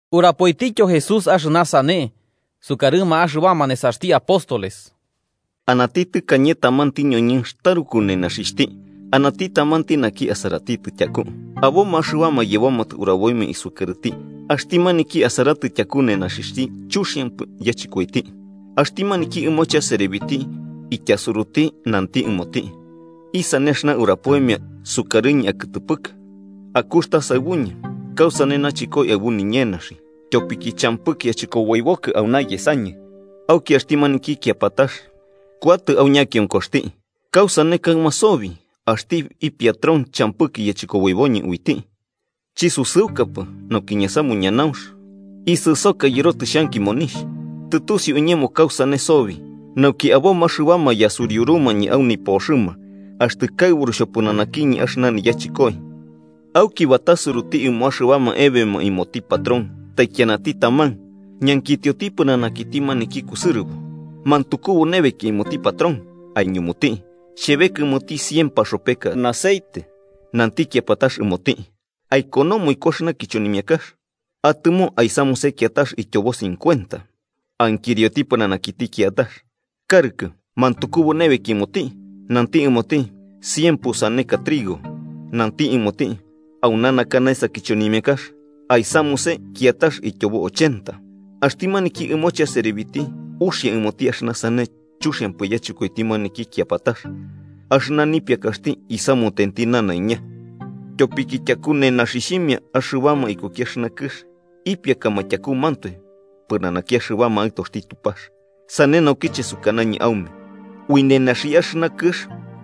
Urapoitityo Jesús axɨna sane sukarɨma axɨbama nesaxti apóstoles: “Anati tɨkañe tamanti ñoñɨnx taruku nenaxixhti anati tamanti naki asaratitɨ tyaku. Aboma axɨbama yebomatɨ uraboimia isukarɨti axti maniki asaratɨ yutaku nenaxixhti chuxiampɨ yachɨkoiti. Axti maniki ɨmohe aserebiti ityasuruti nanti ɨmoti: ‘¿Isane axɨna urapoimia sukarɨñɨ akɨtɨpɨkɨ? Akuxta saɨbuñɨ kausane nachɨkoi aɨbu niñenaxi, tyopiki champɨki achɨkoboibokɨ auna yesañɨ.’ Auki axti maniki kiapatax kuatɨ au ñakionkoxti: ‘¿Kausane kaɨma sobi axti ipiatron champɨki yachɨkoboiboñɨ uiti? Chisusɨukapɨ nauki ñasamu ñanaunx, isɨsoka yɨrotɨ xhanki monixh. Tɨtusiu iñemo kausane sobi, nauki aboma axɨbama yasuriurumañɨ au nipoxɨma axtɨ kaɨburu xhopɨnanakiñɨ axɨna niyachɨkoi.’ Auki batasuruti ɨmo axɨbama ebeoma ɨmoti patrón taikianati taman. Ñankitioti pɨnanakiti maniki kusɨrɨbo: ‘¿Mantukubu nebeki ɨmoti patrón?’ Aiñumuti: ‘Xhebeka ɨmoti cien paxopeka aceite.’ Nanti kiapatax ɨmoti: ‘Aikonomo iku axɨna kichonimiakax. Atɨmo aisamuse kiatax ityobo cincuenta.’ Ankirioti pɨnanakiti kiatax: ‘Karɨkɨ, ¿mantukubu nebeki ɨmoti?’ Nanti ɨmoti: ‘Cien pusaneka trigo.’ Nanti ɨmoti: ‘Auna naka naesa kichonimiakax. Aisamuse kiatax ityobo ochenta.’ Axti maniki ɨmoche aserebiti uxia ɨmoti axɨna sane chuxiampɨ yachɨkoiti maniki kiapatax axɨna nipiakaxti aisamunenti nanaiña. Tyopiki yutaku nenaxixhimia, axibama ikuki axɨna kɨx ipiakama tyakumantoe pɨnanaki axɨbama aɨtoxti Tupax. “Sane naukiche sukanañɨ aume ui nenaxi axɨna kɨx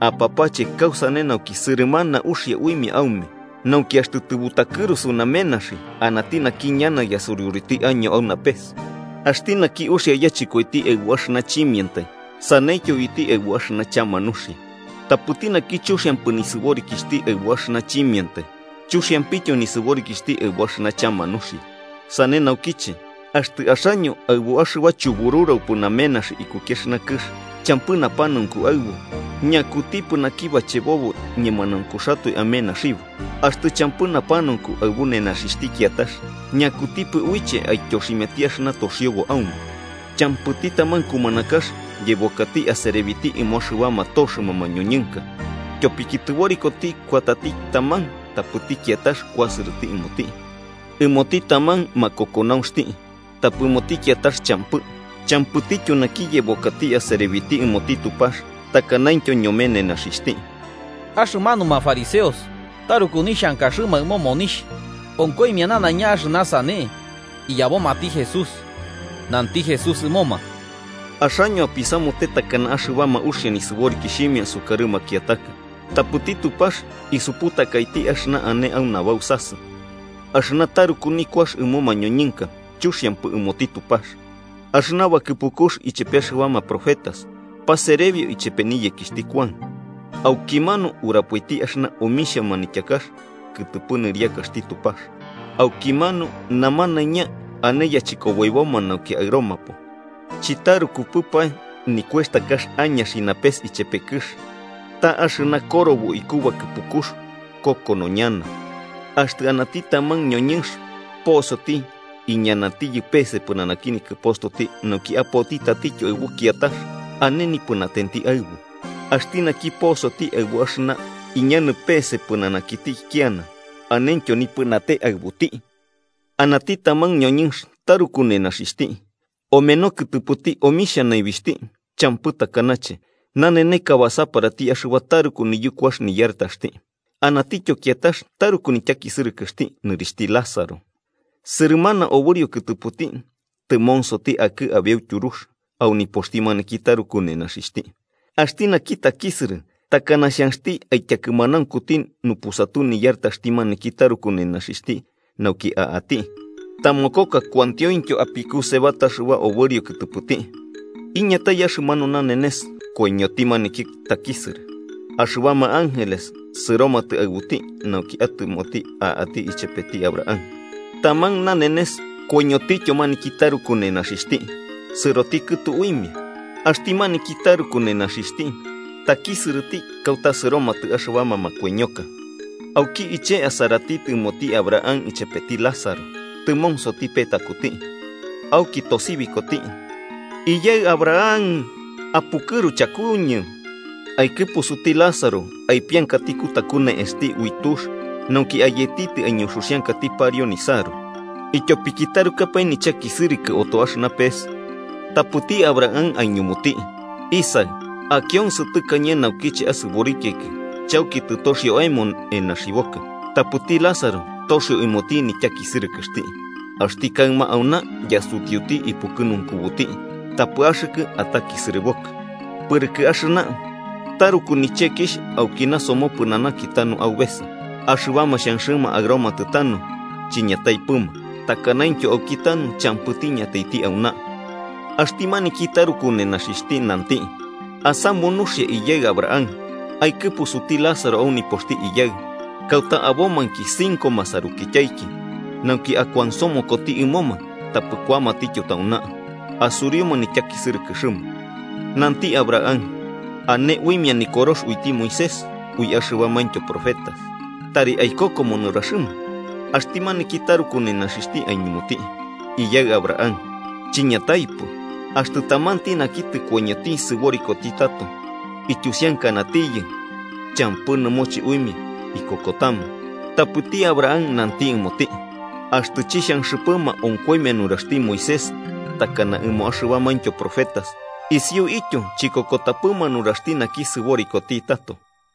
apapache kausane nauki sɨrɨmanama uxia uimia aume, nauki axtɨ tɨbutakɨrusu namenaxi, anati naki ñana yasuriuruti año au napes. “Axti naki uxia yachɨkoiti aɨbu axɨna chimiantai, saneityo uiti aɨbu axɨna chama nuxia. Tapɨti naki chuxiampɨ nisɨborikixhti aɨbu axɨna chimiantai, chuxiampityo nisɨborikixhti aɨbu axɨna chama nuxia. Sane naukiche, axtɨ axaño aɨbu axɨba chubururaupɨ namenaxi ikuki axɨna kɨx champɨ napanaunku aɨbu, ¿ñakutipɨ naki bachebobo ñemanauntu amenaxibo? Axtɨ champɨ napanaunku aɨbu nenaxixhti kiatax, ¿ñakutipɨ uiche aityoximiati axɨna toxiobo aume? “Champɨti taman kumanakax yebokati aserebiti ɨmo axɨbama toxɨma mañoñɨnka. Tyopiki tɨborikoti kuatati taman tapɨti kiatax kuasɨrɨti ɨmoti, ɨmoti taman makokonaunxti tapɨ ɨmoti kiatax champɨ. Champɨtityo naki yebokati aserebiti ɨmoti Tupax takanaintyo ñome nenaxixhti.” Axɨmanuma fariseos, taruku nixhankaxɨma ɨmo monixh, onkoimia nanaiña axɨna sane iyabomati Jesús. Nanti Jesús ɨmoma: “Axaño apisamute takana axɨbama uxia nisɨborikixhimia sukarɨ makiataka, tapɨti Tupax isuputakaiti axɨna ane au nabausasɨ. Axɨna taruku nikuax ɨmo mañoñɨnka chuxiampɨ ɨmoti Tupax. “Axɨna bakɨpukux ichepe axɨbama profetas paserebio ichepe niyekixhti Kuan. Aukimanu urapoiti axɨna omixhia manityakax kɨtɨpɨ nɨriakaxti Tupax, aukimanu namanaiña ane yachɨkoboiboma nauki aɨromapo. “Chitarukupɨpae nikuextakax añaxi napes ichepe kɨx, ta axɨna korobo iku bakɨpukux kokono ñana. “Axtɨ anati taman ñoñɨnx posoti iñanatiyɨ peese pɨnanaki nikɨpostoti nauki apoti tatityo aɨbu kiatax, ane nipɨnatenti aɨbu. Axti naki posoti aɨbu axɨna iñanɨ peese pɨnanakiti ikiana anentyo nipɨnate aɨbuti. “Anati taman ñoñɨnx taruku nenaxixhti, omeno kɨtɨpɨti omixhia naibixhti champɨ takanache naneneka basaparati axɨba taruku niyukuax niyartaxti. Anatityo kiatax taruku nityakisɨrɨkɨxti nɨrixhti Lázaro, sɨrɨmana obɨrio kɨtɨpɨti tɨmonsoti akɨ abeu tyurux au nipoxti maniki taruku nenaxixhti. Axti naki takisɨrɨ takana xhanxti aityakɨmanaunkuti nupusatu niyarataxti maniki taruku nenaxixhti nauki a'ati. Tamokoka kuantioityo apikuseba axɨba obɨrio kɨtɨpɨti. Iñatai axɨmanu nanenes koiñoti maniki takisɨrɨ, axɨbama ángeles sɨromatɨ aɨbuti nauki atɨmoti a'ati ichepeti Abraham. Taman nanenes koiñotityo maniki taruku nenaxixhti, sɨroti kɨtu uimia. “Axti maniki taruku nenaxixhti takisɨrɨti kauta sɨromatɨ axɨbama makoiñoma, auki iche asaratitɨ ɨmoti Abraham chepeti Lázaro tɨmonsoti petakuti. Auki tosibikoti: ‘¡Iyaɨ Abraham, apukɨru chakuñɨ! Aikɨpusuti Lázaro aipiankati kutaku ne'esti ui tux nauki ayeti aiñuxuxiankati pariu nisaru, ityopiki tarukapae nichakisɨrɨkɨ oto axɨna pes.’ Tapɨti Abraham aiñumuti: ‘Isaɨ, akionsɨ tɨkañe naukiche asɨborikiaiki chauki tɨtoxio aemo enaxibokɨ, tapɨti Lázaro toxio ɨmoti nityakisɨrɨkɨxti. Axti kaɨma auna yasutiuti ipukɨnunkubuti, tapɨ axɨkɨ atakisɨrɨkɨbokɨ. Pɨrɨkɨ axɨna, taruku nichekixh aukina somopɨnanaki tanu aubesa. Axɨbama xhanxɨma aɨromatɨ tanu, chiñataipɨma, takanaintyo aukitanu champɨti iñataiti auna.’ “Axti maniki taruku nenaxixhti nanti: ‘Asamu nuxia, iyaɨ Abraham, aikɨpusuti Lázaro au nipoxti iyaɨ, kauta abomainki cinco masarukityaiki, nauki akuansomokoti ɨmoma, tapɨ kuamatityo tauna, asuriuma nityakisɨrɨkɨxɨma.’ Nanti Abraham: ‘Ane uimia Nikorox uiti Moisés ui axɨbamaintyo profetas: ¡tari aikokoma nuraxɨma!’ Axti maniki taruku nenaxixhti aiñumuti: ‘Iyaɨ Abraham, chiñataipɨ. Axtɨ tamanti naki tɨkoiñoti sɨborikoti tato ityusiankanatiyɨ, champɨ nɨmoche uimia ikokotama.’ Tapɨti Abraham nanti ɨmoti: ‘Axtɨ chixhanxɨpɨma onkoimia nuraxti Moisés takana ɨmo axɨbamaintyo profetas, isiuityo chikokotapɨma nuraxti naki sɨborikoti tato.’”